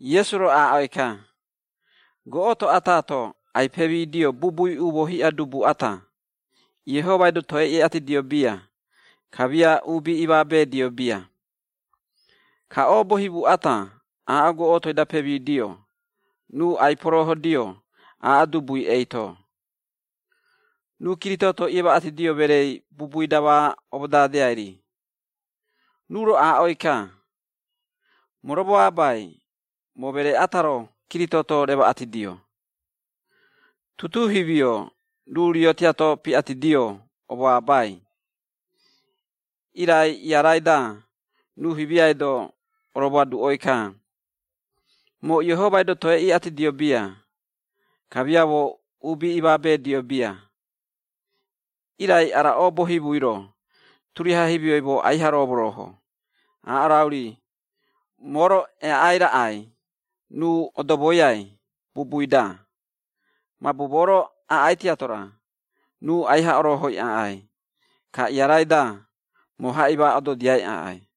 Iesu-ro aaꞌoi-ka, “Goꞌoto ata-to ai-pemidio bubui umoo hiꞌa dubu ata, Iehomai-do toe iꞌatidio bia, kamia uubi imaabeedio bia. Ka oobo himu ata, aaꞌo goꞌotoi-da pemidio, ruu ai-poroohodio, aaꞌo dubui eito, ruu kiritooto iemaꞌatidio mereei bubui-da ma omodadeai-ri. Ruu-ro aaꞌoi-ka, ‘Moo romoabai, moo meree ata-ro kiritooto remaꞌatidio!’ Tutuu himio, ruu rio tiato piꞌatidio omoabai, irai iarai-da, ruu himiai-do oromoaduꞌoi-ka, ‘Moo Iehomai-do toe iꞌatidio bia, kamia moo uubi imaabeedio bia, irai ara oobo himui-ro, turiaha himioi moo aiha romorooho, aaꞌo rau-ri, moo-ro eaꞌai raꞌai ruu odomoiai bubui-da. Mabu moo-ro aꞌai tiato-ra, ruu aiha oroohoi aꞌai, ka iarai-da, moo haꞌima ododiai aꞌai!’”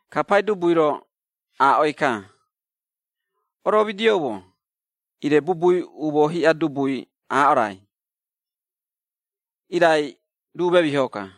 Ka Paidubui-ro aaꞌoi-ka, “Oromidioumo, ire bubui umoo hiꞌa dubui aaꞌo raai, irai ruu memiho-ka.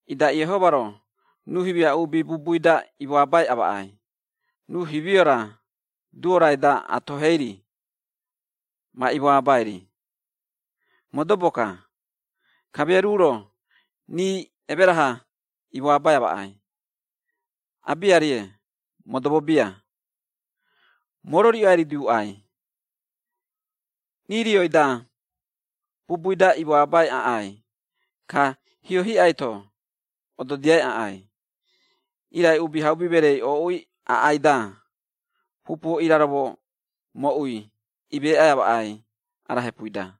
Ida Iehoma-ro, ruu himia uubi bubui-da imoabai amaꞌai, ruu himio-ra duo-raida atohei-ri, ma imoabai-ri? Modobo-ka. Kamia ruu-ro rii emera-ha imoabai amaꞌai? Abiarie, modobo bia. Moo-ro riꞌo ai-riduuꞌai, rii rioi-da bubui-da imoabai aꞌai, ka hio hiꞌai-to ododiai aꞌai. Irai Uubihaubi Mereei ooꞌui aꞌai-da, pupuo iraromo moꞌui emeeꞌai amaꞌai ara hepui-da?”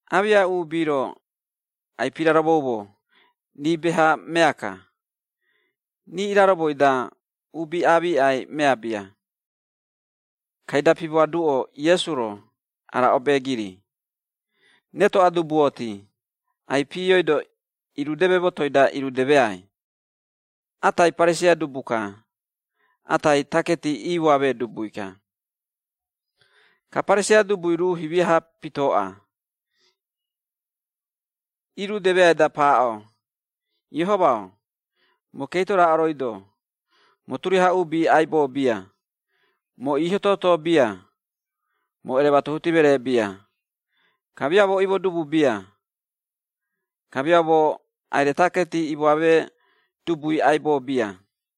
Aamiꞌa uubi-ro ai-piraromoumo, rii beha mea-ka, rii iraromoi-da uubi amiꞌai mea bia, kaida pimoaduꞌo Iesu-ro, ara obeegiri. “Retoꞌa dubuoti, ai-piioido irudeme motoi-da irudemeai, atai Pariseia dubu-ka, atai taketi imoamee dubui-ka. “Ka Pariseia dubui ruu himia-ha pitooꞌa, iirudemeai-da paaꞌo, ‘Iehoma-o, moo keito raaꞌo rooi-do, moo turiaha uubi aibo bia, moo iiho-toto meree bia, moo erematuhuti meree bia, kamia moo imo-dubu bia, kamia moo aire taketi imoamee dubui aibo bia.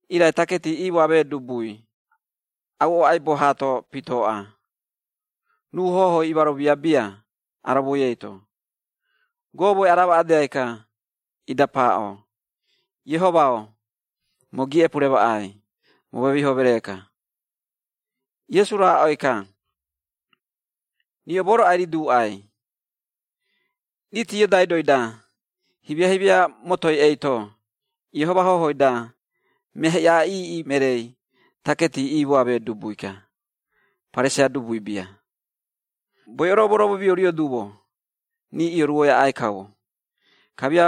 “Irai taketi imoamee dubui auꞌo aibo haato pitooꞌa, ruu hohoi imaromia bia aromoi eito, gomoi aramaꞌedeai-ka, ida paaꞌo, ‘Iehoma-o, moo giiꞌepu remaꞌai, moo memiho meree-ka.’” Iesu-ro aaꞌoi-ka, “Riꞌo moo-ro ai-riduuꞌai, riiti iodaidoi-da himia-himia motoi eito, Iehoma hohoi-da mea hiꞌa iiꞌi mereei taketi iimoamee dubui-ka, Pariseia dubui bia. Boiꞌo-ro, moroomomiourio duumo, rii ioruoi aꞌai kaumo, kamia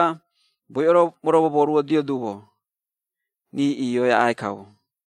boiꞌo-ro, moromomoruodio duumo, rii iioi aꞌai kaumo.”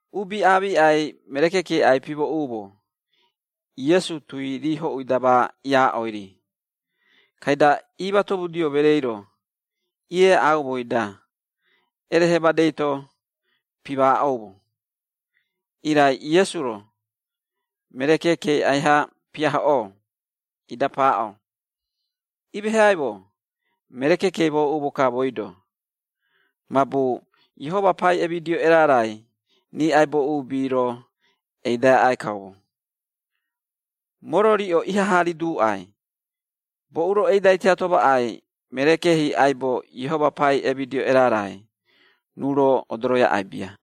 Uubi aamiꞌai, meree keekei ai-pimooꞌumo, Iesu tui rii hoꞌui-da ma iaaꞌoi-ri, kaida iimatomudio mereei-ro, ieaꞌaumoi-da erehe madei-to pimaaꞌoumo, irai, Iesu-ro meree keekei aiha piahoꞌoo, ida paaꞌo “Imeheaimo, meree keekei mooꞌumo-ka mooi-do, mabu Iehoma pai emidio erarai, rii aibo uubi-ro eidai aꞌai kaumo. Moo-ro riꞌo ihaha riduuꞌai, boꞌu-ro eidai tiato maꞌai, meree keehi aibo, Iehoma pai emidio erarai, ruu-ro odoroi aꞌai bia.”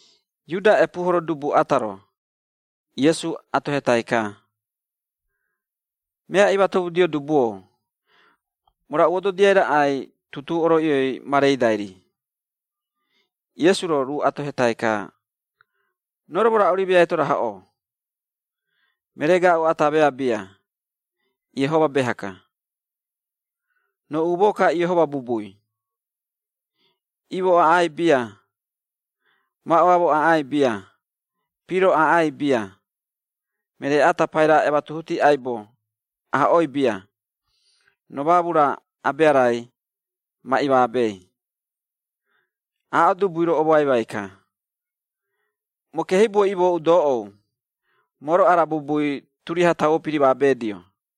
Iuda epuuhoro dubu ata-ro, Iesu atohetai-ka, “Mea imatomudio dubu-o, moo raꞌu ododiai raꞌai tutuu oroiꞌioi ma reidai-ri?” Iesu-ro, ruu atohetai-ka, “Roo-ro moo raꞌu-ri meai-to rahoꞌoo? Meree gaaꞌu ata mea bia, Iehoma beha-ka. Roo umoo-ka Iehoma bubui, ‘Imo aꞌai bia, maꞌoamo aꞌai bia, piro aꞌai bia, meree ata paira ematuhuti aibo, ahoꞌoi bia, roo maamu-ra, abea-rai, ma imaabei.’” Aaꞌo dubui-ro omoaimai-ka, “Moo keehibuoi imooꞌu doꞌou, moo-ro ara bubui turiaha tauo pirimaabedio.”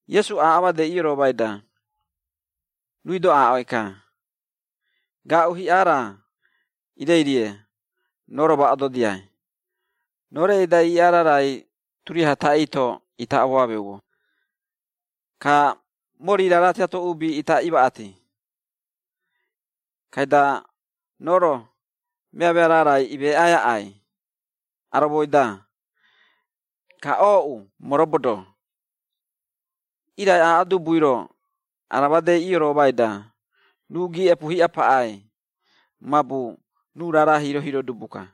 Iesu-ro aaꞌo madei ioroomai-da, ruui-do aaꞌoi-ka, “Gaaꞌu hiꞌa raa ireirie, roo-ro ma ododiai, roo reꞌei-da iiꞌaa raarai turiaha taꞌii-to ita omameumo, ka mori raara tiato uubi ita imaꞌati, kaida roo-ro, meamea raarai imeeꞌai aꞌai aromoi-da, ka ooꞌu, moo robodo.” Irai aaꞌo dubui-ro, ara madei ioroomai-da, ruu giiꞌepu hiꞌa paꞌai, mabu ruu raara hiiro-hiiro dubu-ka.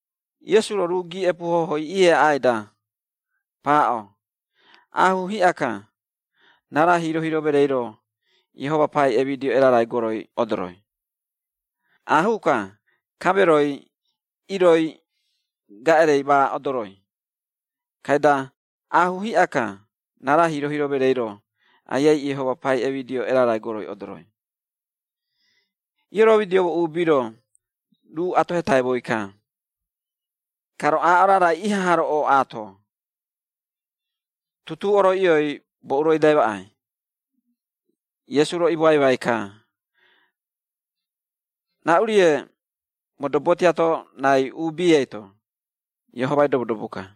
Iesu-ro, ruu giiꞌepu hohoi ieaꞌai-da, paaꞌo, “Aahuu hiꞌa-ka, raara hiiro-hiiro mereei-ro, Iehoma pai emidio erarai goroi odoroi, aahuu-ka kameroi, iroi gaꞌerei ma odoroi, kaida aahuu hiꞌa-ka raara hiiro-hiiro mereei-ro, Aiai Iehoma pai emidio erarai goroi odoroi.” Ioromidioumo uubi-ro, ruu atohetaimoi-ka, “Ka roo aaꞌo raarai ihaha-ro ooꞌaato, tutuu oroiꞌioi boꞌu-ro eidai maꞌai?” Iesu-ro imoaimai-ka, “Raꞌu-rie modobo tiato raai uubi eito, Iehomai-do modobo-ka.”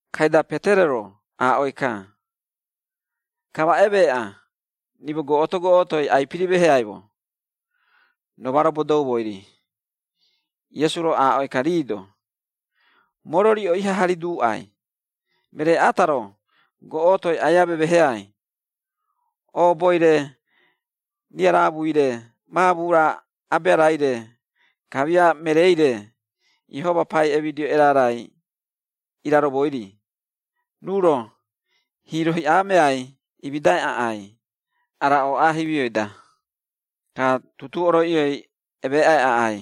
Kaida Petero-ro aaꞌoi-ka, “Ka ma emeeꞌa, rimo goꞌoto-goꞌotoi ai-pirimeheaimo, roo ma robodoumoi-ri.” Iesu-ro aaꞌoi-ka rii-do, “Moo-ro, riꞌo ihaha riduuꞌai, meree ata-ro, goꞌotoi aia memeheai, ooboi-re, riaraamui-re, maamu-ra abea-raire, kamia mereei-re, Iehoma pai emidio erarai iraromoi-ri, ruu-ro hiiro hiꞌa meai imidai aꞌai ara ooꞌa himioi-da, ka tutuu oroiꞌioi, emaꞌai aꞌai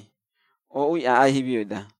ooꞌui aꞌai himioi-da.”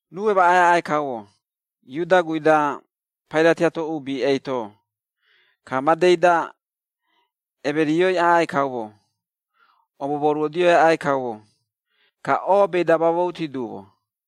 Ruu emaꞌai aꞌai kaumo Iuda guui-da paira tiato uubi eito, ka madei-da emerioi aꞌai kaumo, omomoruodioi aꞌai kaumo, ka oobei-da mamouti duumo.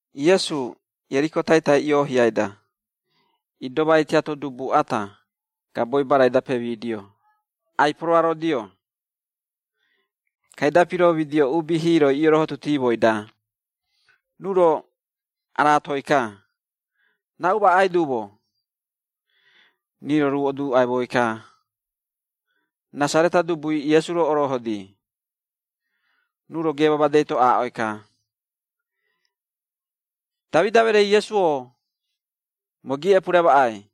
Iesu Ieriko taitai ioohiai-da, idomai tiato dubu ata, gaboi barai-da pemidio, ai-poroarodio. Kaida piromidio uubi hiiroi iorohotutimoi-da, ruu-ro araatoi-ka, “Raꞌu maꞌai duumo?” Rii-ro ruu oduuꞌaimoi-ka, “Rasareta dubui Iesu-ro orohodi.” Ruu-ro geema madei-to aaꞌoi-ka, “Damida mereei Iesu-o, moo giiꞌepu remaꞌai!”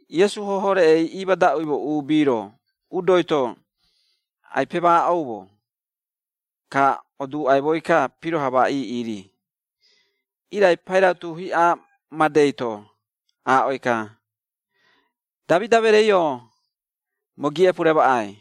Iesu hoho reꞌei imadaꞌuimo uubi-ro udoi-to ai-pemaaꞌoumo, ka oduuꞌaimoi-ka piroha ma iiꞌi-ri, irai pairautu hiꞌa madei-to aaꞌoi-ka, “Damida mereei-o, moo giiꞌepu remaꞌai!”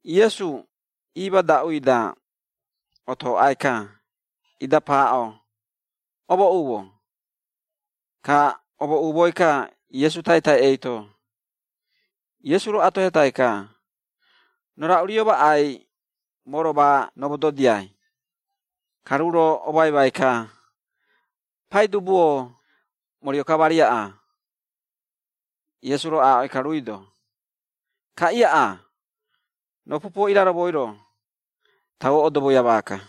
Iesu iimadaꞌui-da, otoꞌai-ka, ida paaꞌo, “Omooꞌumo,” ka omooꞌumoi-ka Iesu taitai eito, Iesu-ro atohetai-ka, “Roo raꞌu rio maꞌai, moo-ro ma romododiai?” Ka ruu-ro omoaimai-ka, “Paidubu-o, moo rio-ka ma riaꞌa.” Iesu-ro aaꞌoi-ka ruui-do, “Ka iaꞌa! Roo pupuo iraromoi-ro, tauo odomoia maaka.”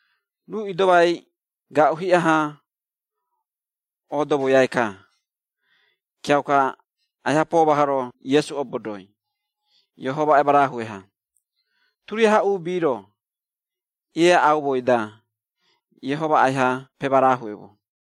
Ruu idomai gaaꞌu hiꞌa-ha odomoiai-ka, kiauka aiha pomahoro Iesu obodoi, Iehoma emarahue-ha. Turiaha uubi-ro ieaꞌaumoi-da, Iehoma aiha pemarahueumo.